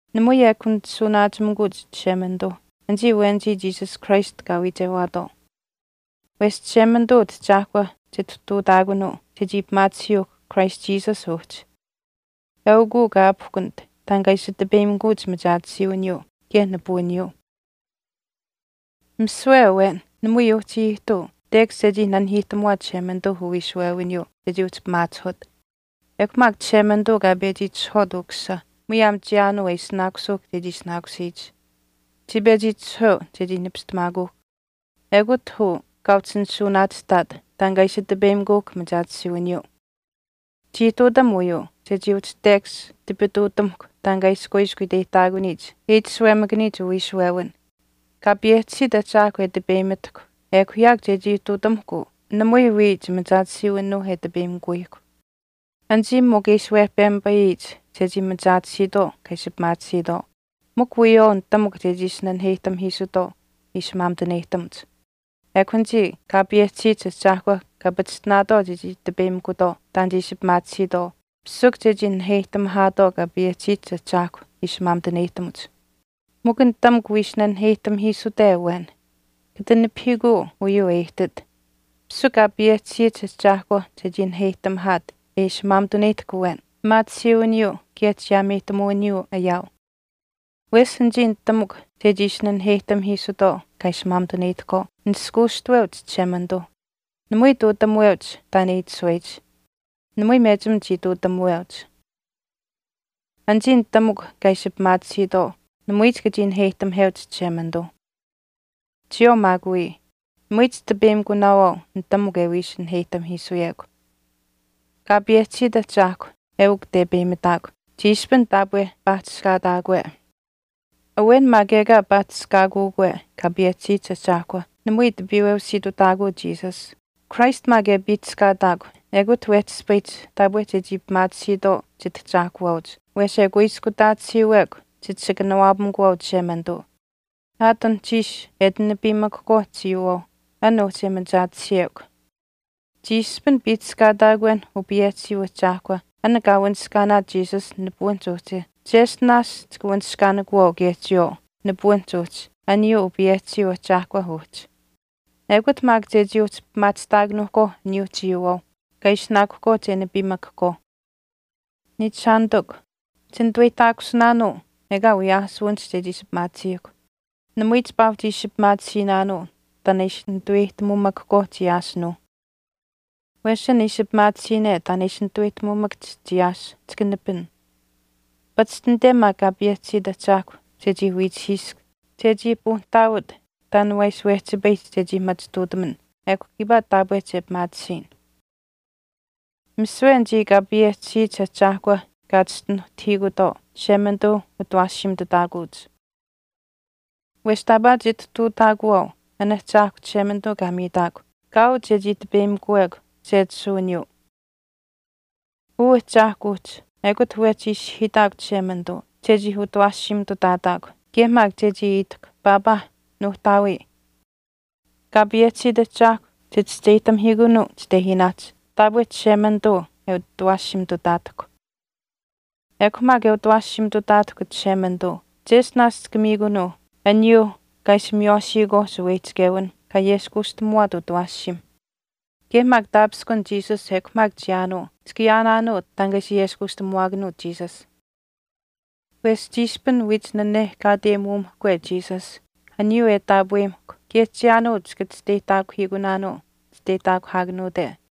Namui ekw nishuuwanaachimikuuch Chishemanituu anichii awenichii Jesus Christ kaa wiichewaatwaau. Wesh Chishemanituu Utahchaahkwa chitihtuutaakunuu chechii pimaatisiyuuhkw Christ Jesus uhchi. Eukuu kaa aapihkunit taan kaa ishi tipeyimikuch machaatisiiwiniyuu kaye nipuwiniyuu. Misiwe awen namui uhchii ihtuu tekash chechii nanihiihtamuwaat Chishemanituuh uwiishuwewiniyuu chechii uhchi pimaachihut. Ekw maak Chishemanituu kaa pechi itishahwaat Ukusisa muyaam chiyaanuu e ishinaakusuuhkw chechii ishinaakusiyich. Chii pechi itishahweu chechii nipistamaakuuhkw. Ekut uu kaa uhchi nishuuwanaachihtaat taan kaa ishi tipeyimikuuhkw machaatisiiwiniyuu. Chii ihtuutam uyuu chechii uhchi tekash tipituutamahkw taan e ishi kuiskw iteyihtaakuniyich e itashuwemakaniyich uwiishuwewin. Kaa payehchisiit Ahchaahkw e tipeyimitahkw ekw yaakw chechii ihtuutamuhkw uu namui wii chimachaatisiiwinuuh e tipeyimikuyihkw. Anichii mikw e ishi wehpemipayiyich chechii machaatisiitwaau kaa ishi pimaatisiitwaau, mikw wiyawaau nitamukw chechii ishi naniheyihtamihiisuutwaau ishi maamituneyihtamuch. Ekw anichii Kaa payehchisiyich Ahchaahkw kaa pachishtinaatwaau chechii tipeyimikutwaau taan che ishi pimaatisiitwaau, pishikw chechii naniheyihtamihaatwaau Kaa payehchisiyich Ahchaahkw ishi maamituneyihtamuch. Mikw nitamukw wiishi naniheyihtamihiisute awen, kata nipahiikuu uyuu e ihtit. Pisikw Kaa payehchisiyich Ahchaahkwa chechii naniheyihtamihaat e ishi maamituneyihtahk awen pimaatisiiwiniyuu kaye chiyaameyihtamuwiniyuu ayaau. Wesh anichii nitamukw chechii ishi naniheyihtamihiisutwaau kaa ishi maamituneyihtahkwaau nishkuushtaweuch Chishemanituuh. Namui ihtuutamuweuch taan e itashuweyich. Namui mechim chii ihtuutamuweuch. Anichii nitamukw kaa ishi pimaatisiitwaau namui chika chii naheyihtamaheuch Chishemanituu. Chiyawaau maak wii, namui chitipeyimikunaawaau nitamukw e wii ishi naheyihtamahiisuyekw. Kaa payehchisiit Ahchaahkw eukw tepeyimitaakw chiishpin taapwe paahchishkaataakwe. Awen maak ekaa paahchishkaakuukwe Kaa payehchisiyich Ahchaahkwa namui tipiiweusiitutaakuu Jesus. Christ maak e piihchishkaataakw ekut wehchi ispayihch taapwe chechii pimaatisiitwaau Chitahchaahkuwaauch wesh e kuiskutaatisiiwekw chit ishi kanawaapamikuwaau Chishemanituu, aat anuhchiish e ati nipiimakahkwaau chiiyuuwaauh an uhchi e machaatisiyekw. Chiishpin paahchishkaataakwenh uu payehchisiyuu Ahchaahkwa an kaa wanishkaanaat Jesus nipuwinihch uhchi cheshtinaash chika wanishkaanikuwaau kaye chiyawaau nipuwinihch uhchi aniyuuh uu payehchisiyuu Ahchaahkwa uhchi. Ekut maak chechii uhchi pimaachihtaakanuuhkwaau aniyuuh chiiyuuwaauh kaa ishinaakuhkwaauh che nipiimakahkwaau. Niichishaanitikw, chinituweyihtaakusinaanuu ekaa wiyaasuwinihch chechii ishi pimaatisiihkw, namui chipaa uhchi ishi pimaatisiinaanuu taan e ishi nituweyihtamuumakahkwaau chiyaasinuuh. Wesh an ishi pimaatisiine taan e ishi nituweyihtamuumakahch chiyaas chika nipin. Pachishtinate maak Kaa payehchisiit Ahchaahkw chechii wiichihiisk chechii puunihtaawat taan waa ishi wehchipayihch chechii machituutam ekw kiipaa taapwe che pimaatisiyin. Misiwe anichii Kaa payehchisiyich Ahchaahkwa kaa chischinuhtahiikutwaau Chishemanituuh utawaashiimitutaakuuch. Wesh taapaa chitihtuutaakuwaau an Ahchaahkw Chishemanituu kaa miitaakw kaau chechii tipeyimikuwekw sechisuwiniyuu. Uu Ahchaahkw uhchi ekut wehchi ishihiitahkw Chishemanituu chechii utawaashiimitutaatahkw kaye maak chechii itahkw “Paapaa, Nuuhtaawii.” Kaa payehchisiit Ahchaahkw chichischeyihtamihiikunuu chitehiinaahch taapwe Chishemanituu e utawaashiimitutaatahkw. Ekw maak e utawaashiimitutaatahkw Chishemanituu cheshtinaash chika miikunuu aniyuuh kaa ishi miywaashiyikwaauh shaweyihchichewinh kaa ayeskuushtamuwaat utawaashiimh. Kaye maak taapishkun Jesus ekw maak chiyaanuu chika ayaanaanuu taan kaa ishi ayeskuushtamuwaakanuut Jesus. Wesh chiishpin wiich nanehkaateyimuumahkwe Jesus aniyuu e taapweyimahkw kaye chiyaanuu chika chisteyihtaakuhiikunaanuu chisteyihtaakuhaakanuute.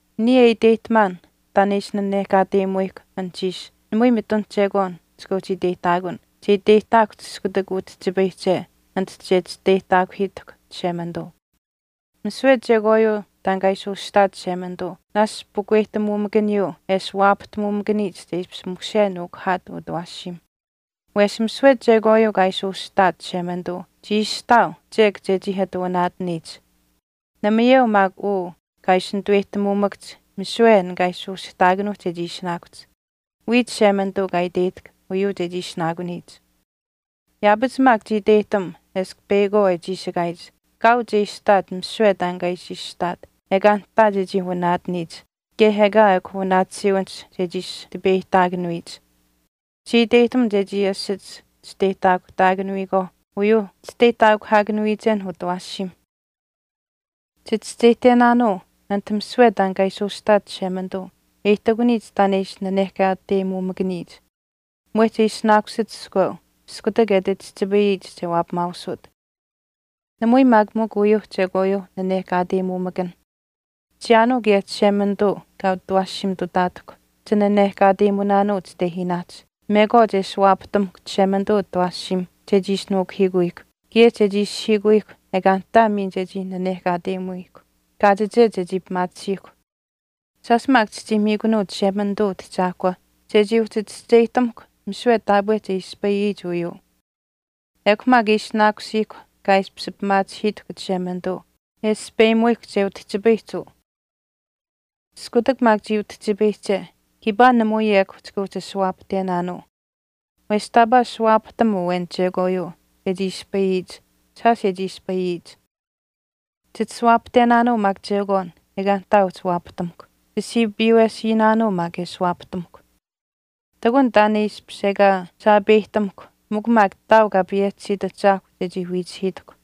Niya e iteyihtamaan taan e ishi nanehkaateyimuyihkw anuhchiish namui mitun chekwaan chika uhchi iteyihtaakun che iteyihtaakuhch iskutak utihchipayihche anit che chisteyihtaakuhiitahkw Chishemanituu. Misiwe chekwaayuu taan kaa ishi ushihtaat Chishemanituu naashch pukweyihtamuumakaniyuu e ashuwaapahtamumakaniyich che ishpish mushe nuukuhaat utawaashiim. Wesh misiwe chekwaayuu kaa ishi ushihtaat Chishemanituu chii ishihtaau chek chechii ati wanaataniyich. Namayeu maak uu kaa ishi nituweyihtamuumakahch misiwe an kaa ishi ushihtaakanuuhch chechii ishinaakuhch. Wiya Chishemanituu kaa iteyihtahk uyuu chechii ishinaakuniyich. Yaapach maak chii iteyihtam eshkw peyakwaau e chiishikaayich kaau che ishihtaat misiwe taan kaa ishi ushihtaat ekaa nihtaa chechii wanaatiniyich kaye ekaa ekw wanaatisiiwinihch chechii ishi tipeyihtaakuniyich. Chii iteyihtam chechii asich chisteyihtaakuhtaakanuyikwaauh uyuuh chisteyihtaakuhaakanuwiichenh utawaashiimh. Chichischeyihtenaanuu anit misiwe taan kaa ishi ushihtaat Chishemanituu e ihtakuniyich taan e ishi nanehkaateyimuumakaniyich, mwehch e ishinaakusit iskweu iskutak e ati chihchipayiyich che waapamaausut. Namui maak mikw uyuuh chekwaayuuh nanehkaateyimuumakanh. Chiyaanuu kaye Chishemanituu kaa utawaashiimitutaatahkw chinanehkaateumunaanuu chitehiinaahch mekwaach e ashuwaapatamahkw Chishemanituu utawaashiimh chechii ishi nuukuhiikuyihkw kaye chechii ishihiikuyihkw ekaa nihtaa miin chechii nanehkaateyimuwiihkw, kaachiche chechii pimaatisiihkw. Shaash maak chichii miikunuu Chishemanituu Utahchaahkwa chechii uhchi chischeyihtamuhkw misiwe taapwe che ispayiyich uyuu. Ekw maak e ishinaakusiihkw kaa ishpish pimaachihiitahkw Chishemanituu e aspeyimuyihkw che utihchipayihch uu. Iskutak maak chii utihchipayihche kiipaa namui ekw chika uhchi ashuwaapahtenaanuu. Wesh taapaa ashuwaapahtam awen chekwaayuu chechii ispayiyich shaash e chii ispayiyich. Chitasuwaapahtenaanuu maak chekwaan ekaa nihtaa uhchi waapahtamukw. Chisiipiiwesiinaanuu maak e ashuwaapahtamuhkw. Ihtakun taan e ishpish ekaa saapeyihtamuhkw mikw maak ihtaau Kaa payehchisiit Ahchaahkw chechii wiichihiitahkw.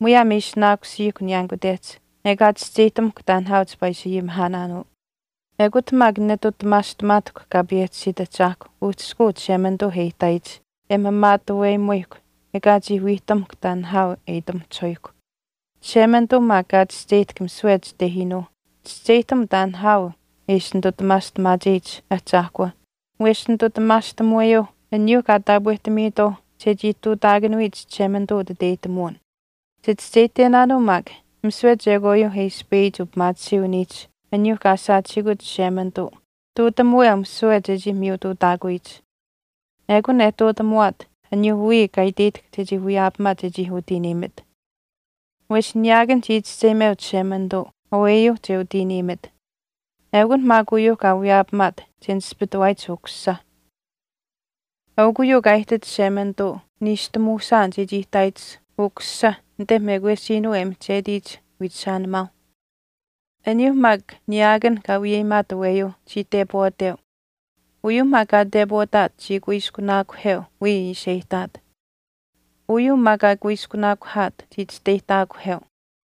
Muyaam e ishinaakusiihkw niyaanikutehch ekaa chischeyihtamuhkw taan nihaau chipaa ishi ayimihaanaanuu. Ekut maak netutamaastamaatahkw Kaa payehchisiit Ahchaahkw uhchishkuu Chishemanituuh e ihtaayich e maamaatuweumuyihkw ekaa chii wiihtamuhkw taan nihaau e itamahchihuyihkw. Chishemanituu maak kaa chischeyihtahk misiwe chitehiinuuh chischeyihtam taan nihaau e ishi nitutamaastamaacheyich Ahchaahkw wesh nitutamaastamuweyuuh aniyuuh kaa taapwehtamiitwaauh chechii ihtuutaakanuyich Chishemanituu utiteyihtamuwin. Chichischeyihtenaanuu maak misiwe chekwaayuu e ispayiyich upimaatisiiwiniihch aniyuuh kaa saachihiikut Chishemanituu ihtuutamuweu misiwe chechii miyutuutaakuyich. Ekun e ihtuutamuwaat aniyuuh wiya kaa iteyihtahk chechii wiyaapamaat chechii utiiniimit. Wesh niyaakan chii chischeyimeu Chishemanituu aweyuu che utiiniimit, eukun maak uyuuh kaa wiyaapamaat che nispitawaayich Ukusisa. Eukw uyuu kaa ihtit Chishemanituu niishtamuushaan chechii ihtaayich Ukusisa anit mekwesiinuu e mihchetiyich wiichishaanimaauh. Aniyuuh maak niyaakan kaa wiyeyimaat aweyuu chii tepwaateu. Uyuuh maak kaa tepwaataat chii kuiskunaakuheu wiya ishi e ihtaat. Uyuu maa kaa kuiskunaakuhaat chii chisteyihtaakuheu.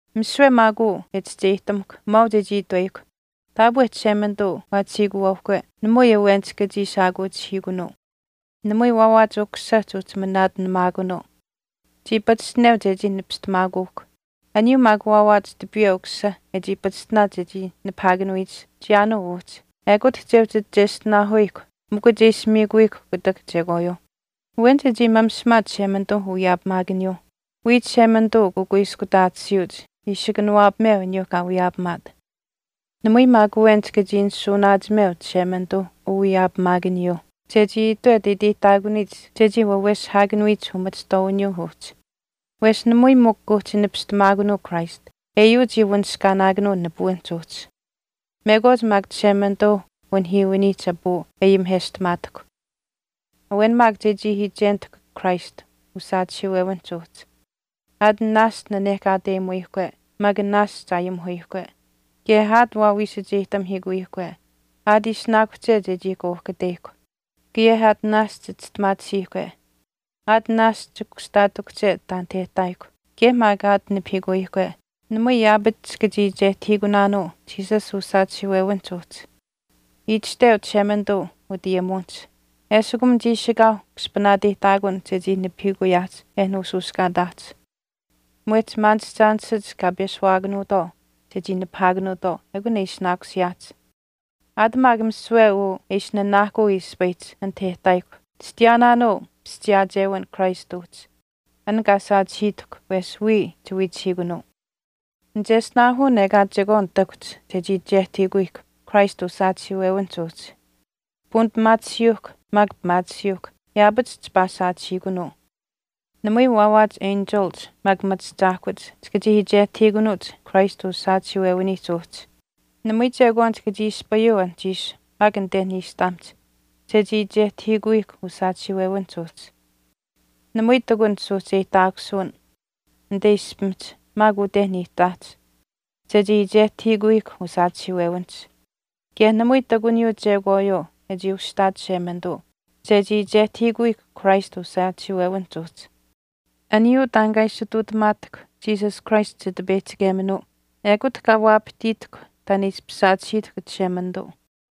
Misiwe maak uu e chischeyihtamahkw maau chechii itweyihkw, taapwe Chishemanituu waachihiikuwaauhkwe namui awen chika chii shaakuuchihiikunuu. Namui waawaach Ukusisa chuuhchi manaatinamaakunuu. Chii pachishtineu chechii nipistamaakuuhkw. Aniyuu maak waawaach tipiiwe Ukusisa e chii pachishtinaat chechii nipahaakanuyich chiyaanuu uhchi ekut che uhchi cheshtinaahuyihkw mikw che ishi miikuyihkw kutak chekwaayuuh. Awen chechii mamishimaat Chishemanituuh uwiyaapimaakaniyuuh. Wiya Chishemanituu ukuiskutaatisiiuch ishi kanawaapameu aniyuu kaa wiyaapamaat. Namui maak awen chika chii nishuuwanaachimeu Chishemanituuh uwiyaapimaakaniyuuh chechii itwet e iteyihtaakuniyich chechii waweshihaakanuyich umachihtwaawiniyuu uhchi. Wesh namui mikw kuuhchi nipistamaakunuu Christ eyuu chii wanishkaanaakanuu nipuwinihch uhchi. Mekwaach maak Chishemanituuh unihiiwiniihch apuu e ayimiheshtamaatahkw. Awen maak chechii iichenitahkw Christ usaachihiiwewiniihch uhchi. Aat naashch nanehkaateyimuwiihkwe maak naashch aayimuhuyihkwe, kaye aat wawiisacheyihtamihiikuwiihkwe, aat ishinaakuhche chechii kauhkateyihkw, kaye aat naashch chistimaatisiihkwe, aat naashch kushtaatikuhche taanit e ihtaayihkw kaye maak aat nipahiikuyihkwe namui yaapach chika chii iichehtahiikunaanuu Jesus usaachihiiwewinihch uhchi. Itashteu Chishemanituu utayimuwinihch, Eshikum chiishikaauh kushpaneyihtaakun chechii nipahiikuyaahch e nuushuushkaataahch. Mwehch maanishchaanishach kaa peshuwaakanuutwaau chechii nipahaakanuutwaau ekun e ishinaakusiyaahch. Aat maak misiwe uu e ishi nanaahkuu ispayihch anit e ihtaayihkw chitayaanaanuu pischiyaachewin Christ uhchi, an kaa saachihiitahkw wesh wiya chiwiichihiikunuu. Nicheshtinaahun ekaa chekwaan ihtakuhch chechii iichehtahiikuyihkw Christ usaachihiiwewinihch uhchi. Puunipimaatisiyuuhkw maak pimaatisiyuuhkw yaapach chipaa saachihiikunuu. Namui waawaach enchilich maak machi ahchaahkuhch chika chii iichehtahiikunuuch Christ usaachihiiwewiniihch uhchi. Namui chekwaan chika chii ispayuu anuhchiish maak anite niishtamihch chechii iichehtahiikuyihkw usaachihiiwewinihch uhchi. Namui ihtakunh suuhcheyihtaakusuwinh anite ishpimihch maak ute niihtaahch chechii iichehtahiikuyihkw usaachihiiwewinihch. Kaye namui ihtakuniyuu chekwaayuu e chii ushihtaat Chishemanituu chechii iichehtahiikuyihkw Christ uu saachihiiwewinihch uhchi. Aniyuu taan kaa ishi ihtuutamaatahkw Jesus Christ Chitipeyihchikeminuuh ekut kaa waapahtiitahkw taan e ishpish saachihiitahkw Chishemanituu.